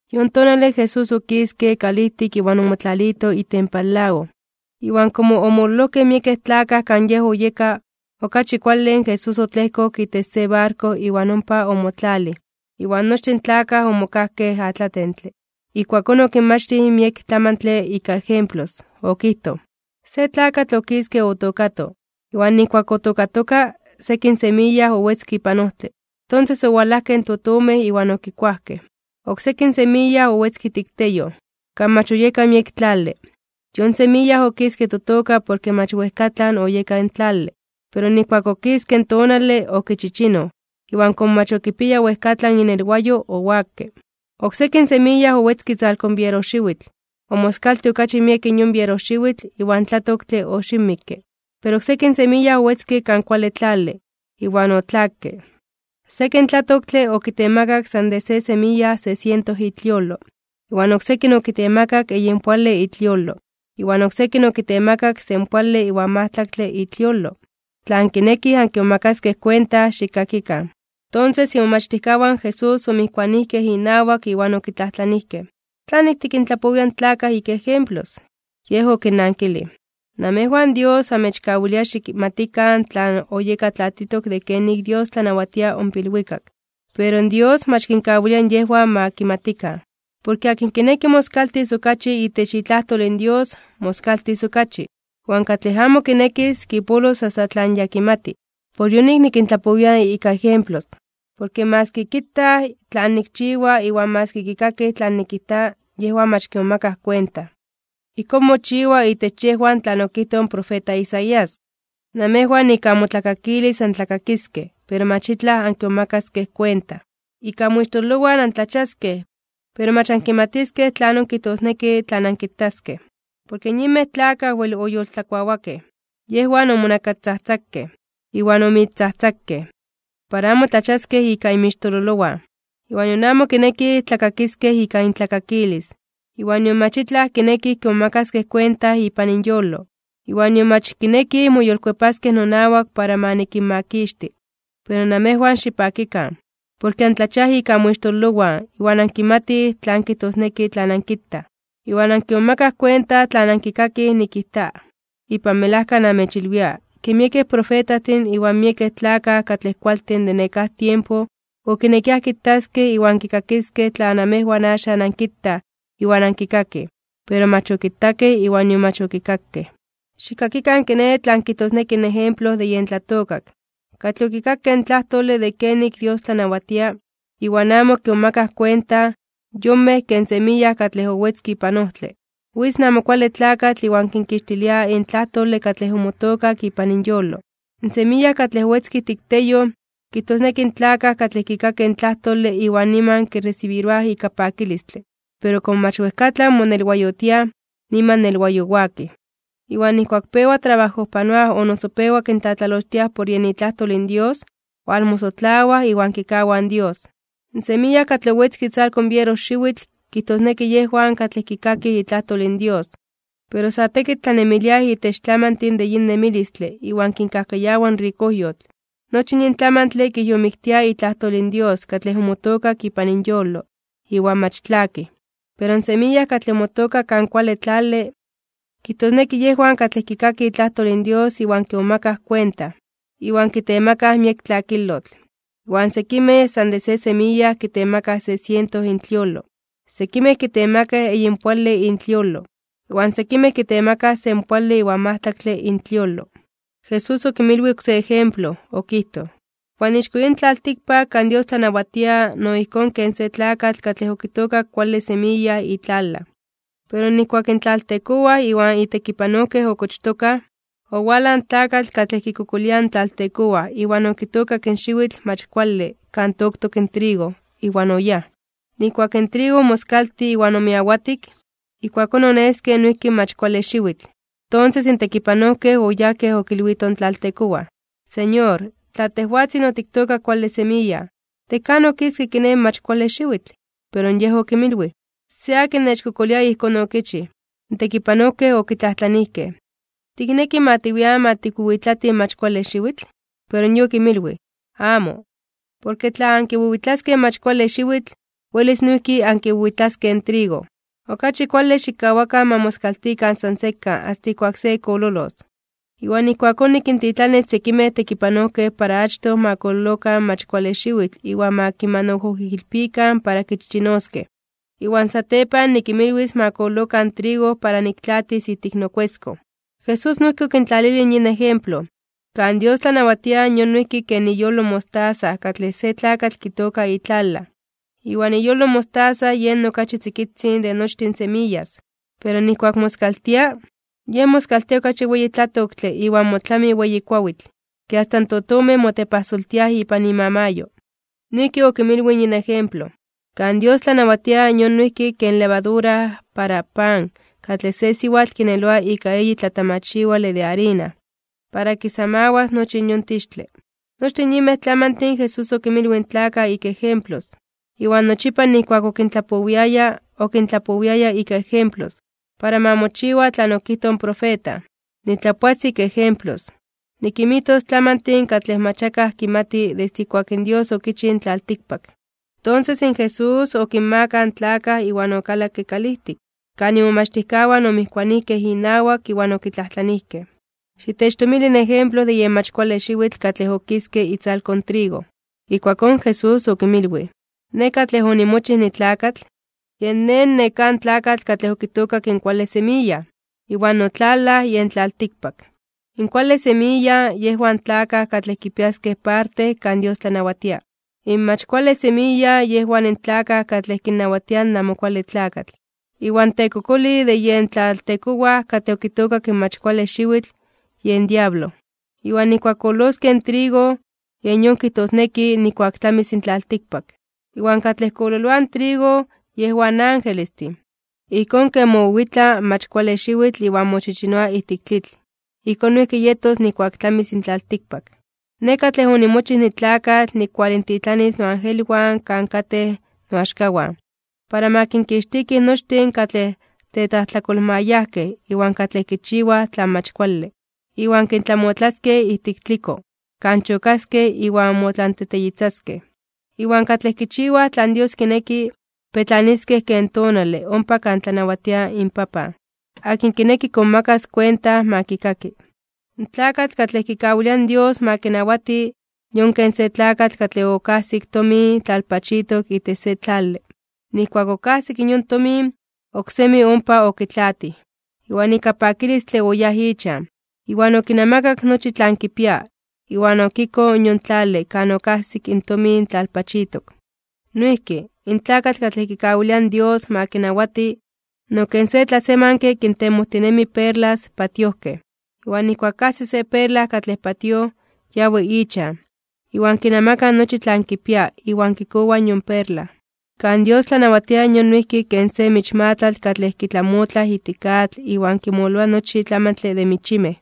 Yon tonale Jesús okiske kalijtik iwan omotlalito itempan lago. Iwan komo omololojkej miekej tlakaj kan Yej oyeka, okachi kuale in Jesús otlejkok itech se barko iwan ompa ipan omotlalij, iwan nochtin in tlakaj omokajkej atlatentle. Ijkuakón okinmachtij miek tlamantle ika ejemplos. Okijtoj: ―Se tlakatl okiske otookato. Iwan nijkuak otookatoka, sekin semiya owetzke ipan ojtle. Tonses owalajkej in totomej iwan okikuajkej. Oksekin semiya owetzke ijtik teyoj, kan mach oyeka miek tlale. Yon semiya okiske totoka porke mach wejkatlan oyeka in tlale. Pero nijkuak okiske in tonale, okichichinoj, iwan komo mach okipiaya wejkatlan inelwayo, owakke. Oksekin semiya owetzke itzalko in bierojxiwitl, omoskaltij okachi miek yon bierojxiwitl, iwan tlatoktle oxiwmikke. Pero oksekin semiya owetzke kan kuale tlale, iwan otlakke. Sekin tlatoktle okitemakak san de se semiya se siento itliolo, iwan oksekin okitemakak eyinpoale itliolo, iwan oksekin okitemakak senpoale iwan majtlaktle itliolo. Tla ankinekij ankimomakaskej kuenta, xikkakikan. Tonses imomachtijkawan in Jesús omijkuanijkej inawak iwan okitlajtlanijkej: ―¿Tlanik tikintlapowia in tlakaj ika ejemplos? Yej okinnankilij: ―Namejwan Dios amechkawilia xikmatikan tlan oyeka tlatitok de kenik Dios tlanawatia ompa ilwikak. Pero Dios mach kinkawilia yejwan ma kimatikan. Porke akin kinekis moskaltis okachi itech itlajtol in Dios, moskaltis okachi. Iwan katlej amo kinekis, kipolos asta tlan ya kimati. Por yonik nikintlapowia ika ejemplos, porke maski kitaj tlan nikchiwa iwan maski kikakij tlan nikijta, yejwan mach kimomakaj kuenta. Ijkón, mochiwa itech yejwan tlan okijtoj in profeta Isaías: Namejwan ika amotlakakilis antlakakiskej, pero mach itlaj ankimomakaskej kuenta. Ika amoixtololowan antlachiaskej, pero mach ankimatiskej tlanon kijtosneki tlan ankitaskej. Porke in yinmej tlakaj wel oyoltlakuawakej, yejwan omonakastzajtzakej, iwan omoixtzajtzakej para amo tlachiaskej ika inmixtololowan, iwan nion amo kinekij tlakakiskej ika intlakakilis, nion mach itlaj kinekij kimomakaskej kuenta ipan inyolo, iwan nion mach kinekij moyolkuepaskej nonawak para ma nikinmakixti. ’Pero namejwan xipakikan, porke antlachiaj ika amoixtololowan, iwan ankimatij tlan kijtosneki tlan ankitaj. Iwan ankimomakaj kuenta tlan ankikakij nikijta. Ipan melajka namechilwia, ke miekej profetajtin iwan miekej tlakaj katlej kualtin de nekáj tiempo okinekiaj kitaskej iwan kikakiskej tlan namejwan axan ankitaj iwan ankikakij, pero mach okitakej iwan nion mach okikakej. ’Xikkakikan kiné tlan kijtosneki in ejemplo de yen tlatookak. Katlej okikakej in tlajtole de kenik in Dios tlanawatia, iwan amo kimomakaj kuenta, yonmej ken semiya katlej owetzke ipan ojtle. Witz in Amo Kuale Tlakatl iwan kinkixtilia in tlajtole katlej omotookak ipan inyolo. In semiya katlej owetzke ijtik teyoj, kijtosneki in tlakaj katlej kikakij in tlajtole iwan niman kiresibiroaj ika pakilistle, pero komo mach wejkatlan monelwayotiaj, niman nelwayowakij. Iwan nijkuak pewa trabajojpanoaj o noso pewa kintlatlalochtiaj por yen itlajtol in Dios, walmosotlawaj iwan kikawaj in Dios. In semiya katlej owetzke itzalko in bierojxiwitl, kijtosneki yejwan katlej kikakij itlajtol in Dios, pero sa tekitl tlanemiliaj itech tlamantin de yin nemilistle iwan kinkajkayawa in rikojyotl. Nochi in yin tlamantle kijyomiktia itlajtol in Dios katlej omotookak ipan inyolo, iwan mach tlakij. Pero in semiya katlej omotookak kan kuale tlale, kijtosneki yejwan katlej kikakij itlajtol in Dios iwan kimomakaj kuenta, iwan kitemakaj miek tlakilotl. Iwan sekimej san de se semiya kitemakaj se siento intliolo, sekimej kitemakaj eyinpoale intliolo, iwan sekimej kitemakaj senpoale iwan majtlaktle intliolo. Jesús okinmilwij oksé ejemplo, okijtoj: ―Iwan ixko yin tlaltikpak kan Dios tlanawatia no ijkón ken se tlakatl katlej okitookak kuale semiya itlalaj. Pero nijkuak in tlaltekowaj iwan itekipanojkej okochtokaj, owalaj in tlakatl katlej kikokolia in tlaltekowaj iwan okitookak xiwitl mach kuale kan toktok trigo, iwan oyáj. Nijkuak in trigo omoskaltij iwan omiawatik, ijkuakón oneske noijki in mach kuale xiwitl. Tonses in tekipanojkej oyajkej okilwitoj in tlaltekowaj: “Señor, tla tejwatzin otiktookak kuale semiya, ¿de kan okiske kiné, in mach kuale xiwitl?” Pero yej okinmilwij: “Se katlej nechkokolia ijkón okichij.” In tekipanojkej okitlajtlanijkej: “¿Tikneki ma tiwian ma tikwiwitlatij in mach kuale xiwitl?” Pero yej okinmilwij: “Amo, porke tla ankiwiwitlaskej in mach kuale xiwitl, welis noijki ankiwiwitlaskej in trigo. Okachi kuale xikkawakan ma moskaltikan san sekan asta ijkuak se kololos. Iwan ijkuakón nikintitlanis sekimej tekipanojkej para achtoj ma kololokan in mach kuale xiwitl iwan ma kimanojoijilpikan para kichichinoskej. Iwan satepan nikinmilwis ma kololokan in trigo para niktlaatis ijtik nokueskon.” Jesús noijki okintlalilij yin ejemplo: ―Kan Dios tlanawatia yon noijki ken iyolo in mostaza katlej se tlakatl kitooka itlalaj. Iwan iyolo in mostaza yen okachi tzikitzin de nochtin semiyas. Pero nijkuak moskaltia, yen moskaltia okachi weyi tlatoktle iwan motlami weyi kuawitl, ke asta in totomej motepajsoltiaj ipan imamayo. Noijki okinmilwij in yin ejemplo: ―Kan Dios tlanawatia yon noijki ken levadura para pan katlej se siwatl kineloa ika eyi tlatamachiwale de arina, para kisamawas nochi in yon tixtle. Nochtin in yinmej tlamantin Jesús okinmilwij in tlakaj ika ejemplos. Iwan nochipa nijkuak okintlapowiaya, okintlapowiaya ika ejemplos. Para ma mochiwa tlan okijtoj in profeta: Nitlapoas ika ejemplos. Nikinmijtos tlamantin katlej mach akaj kinmati desde ijkuak in Dios okichij in tlaltikpak. Tonses in Jesús okinmakaj in tlakaj iwan okalakke kalijtik, kan imomachtijkawan omijkuanijkej inawak iwan okitlajtlanijkej: ―Xitechtomili in ejemplo de yen mach kuale xiwitl katlej okiske itzalko in trigo. Ijkuakón Jesús okinmilwij: ―Nej katlej onimochij nitlakatl, yen Nej in nekáj tlakatl katlej okitookak in kuale semiya. Iwan notlalaj, yen tlaltikpak. In kuale semiya, yejwan in tlakaj katlej kipiaskej parte kan Dios tlanawatia. In mach kuale semiya, yejwan in tlakaj katlej kinnawatia in Amo Kuale Tlakatl. Iwan in tekokolij de yen tlaltekowaj katlej okitookak in mach kuale xiwitl, yen diablo. Iwan nijkuak kololoskej in trigo, yen yon kijtosneki nijkuak tlamis in tlaltikpak. Iwan katlej kololoaj in trigo, yejwan in angelestin. Ijkón ken mowiwitla in mach kuale xiwitl iwan mochichinoa ijtik tlitl, ijkón noijki yetos nijkuak tlamis in tlaltikpak. Nej katlej onimochij nitlakatl nikualintitlanis noangelwan kan katej noaxkawan, para ma kinkixtikij nochtin katlej tetlajtlakolmayajkej iwan katlej kichiwaj tlan mach kuale. Iwan kintlamotlaskej ijtik tliko, kan chokaskej iwan motlanteteyitzaskej. Iwan katlej kichiwaj tlan Dios kineki, petlaniskej ken tonale ompa kan tlanawatia inPapan. Akin kineki kimomakas kuenta, ma kikaki. ’In tlakatl katlej kikawilia in Dios ma kinawati, yon ken se tlakatl katlej okajsik tomin tlalpachitok itech se tlale. Nijkuak okajsik in yon tomin, oksemi ompa okitlaatij. Iwan ika pakilistle oyáj ichan, iwan okinamakak nochi tlan kipia. Iwan okikoj in yon tlale kan okajsik in tomin tlalpachitok. ’Noijki, in tlakatl katlej kikawilia in Dios ma kinawati, no ken se tlasemanke kintemojtinemi perlas patiojkej, iwan nijkuak kajsi se perla katlej patíoj, yawi ichan, iwan kinamaka nochi tlan kipia, iwan kikowa yon perla. ’Kan Dios tlanawatia yon noijki ken se michmatlatl katlej kitlamotlaj ijtik atl iwan kinmololoa nochi tlatlamantle de michimej.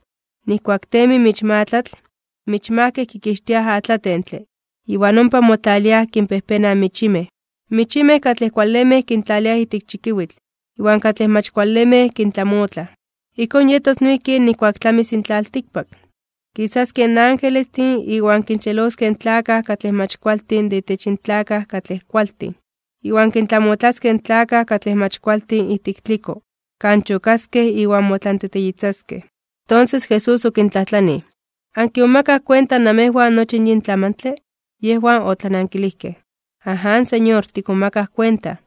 Nijkuak temi in michmatlatl, in michmajkej kikixtiaj atlatentle, iwan ompa motlaliaj kinpejpenaj in michimej. In michimej katlej kualemej kintlaliaj ijtik chikiwitl, iwan katlej mach kualemej kintlamotlaj. Ijkón yetos noijki nijkuak tlamis in tlaltikpak. Kisaskej in angelestin iwan kinxeloskej in tlakaj katlej mach kualtin de intech in tlakaj katlej kualtin. Iwan kintlamotlaskej in tlakaj katlej mach kualtin ijtik tliko, kan chokaskej iwan motlanteteyitzaskej. Tonses Jesús okintlajtlanij: ―¿Ankimomakaj kuenta namejwan nochi in yin tlamantle? Yejwan otlanankilijkej: ―Aján, Señor, tikmomakaj kuenta.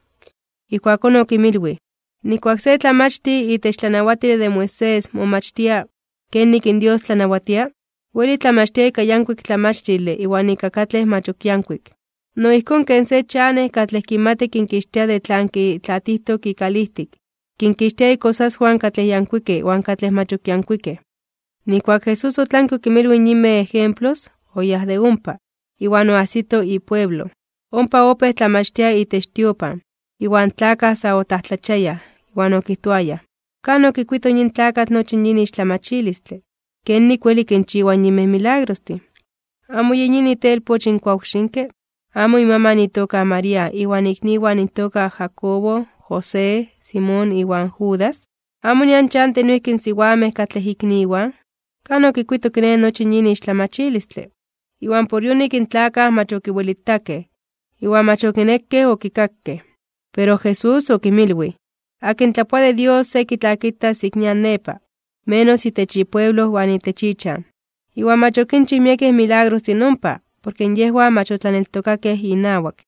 Ijkuakón okinmilwij: ―Nijkuak se tlamachtij itech tlanawatile de Moisés momachtia kenik in Dios tlanawatia, weli tlamachtia ika yankuik tlamachtile iwan ika katlej mach ok yankuik. No ijkón ken se chanej katlej kimati kinkixtia de tlan kintlaatijtok ikalijtik, kinkixtia ikosaswan katlej yankuikej iwan katlej mach ok yankuikej. Nijkuak in Jesús otlanke okinmilwij in yinmej ejemplos, oyáj de ompa. Iwan oajsito ipueblo. Ompa opéj tlamachtia itech tiopan, iwan tlakaj sa otlajtlachiayaj (omomajmawtiayaj), iwan okijtoayaj: ―¿Kan okikuito yin tlakatl nochi yin ixtlamachilistle? ¿Kenik weli kinchiwa in yinmej milagrostin? ¿Amo yen yin itelpoch in kuawxinke? ¿Amo imaman itoka María, iwan ikniwan intoka Jacobo, José, Simón, iwan Judas? ¿Amo nian chantij noijki in siwamej katlej ikniwan? ¿Kan okikuito kiné, nochi yin ixtlamachilistle? Iwan por yonik in tlakaj mach ok okiwelitakej, iwan mach ok okinekej okikakej. Pero Jesús okinmilwij: ―Akin tlapoa de Dios se kitlakitas ik nian nepa, menos itech ipueblo iwan itech ichan. Iwan mach okinchij miekej milagrostin ompa, porke yejwan mach otlaneltokakej inawak.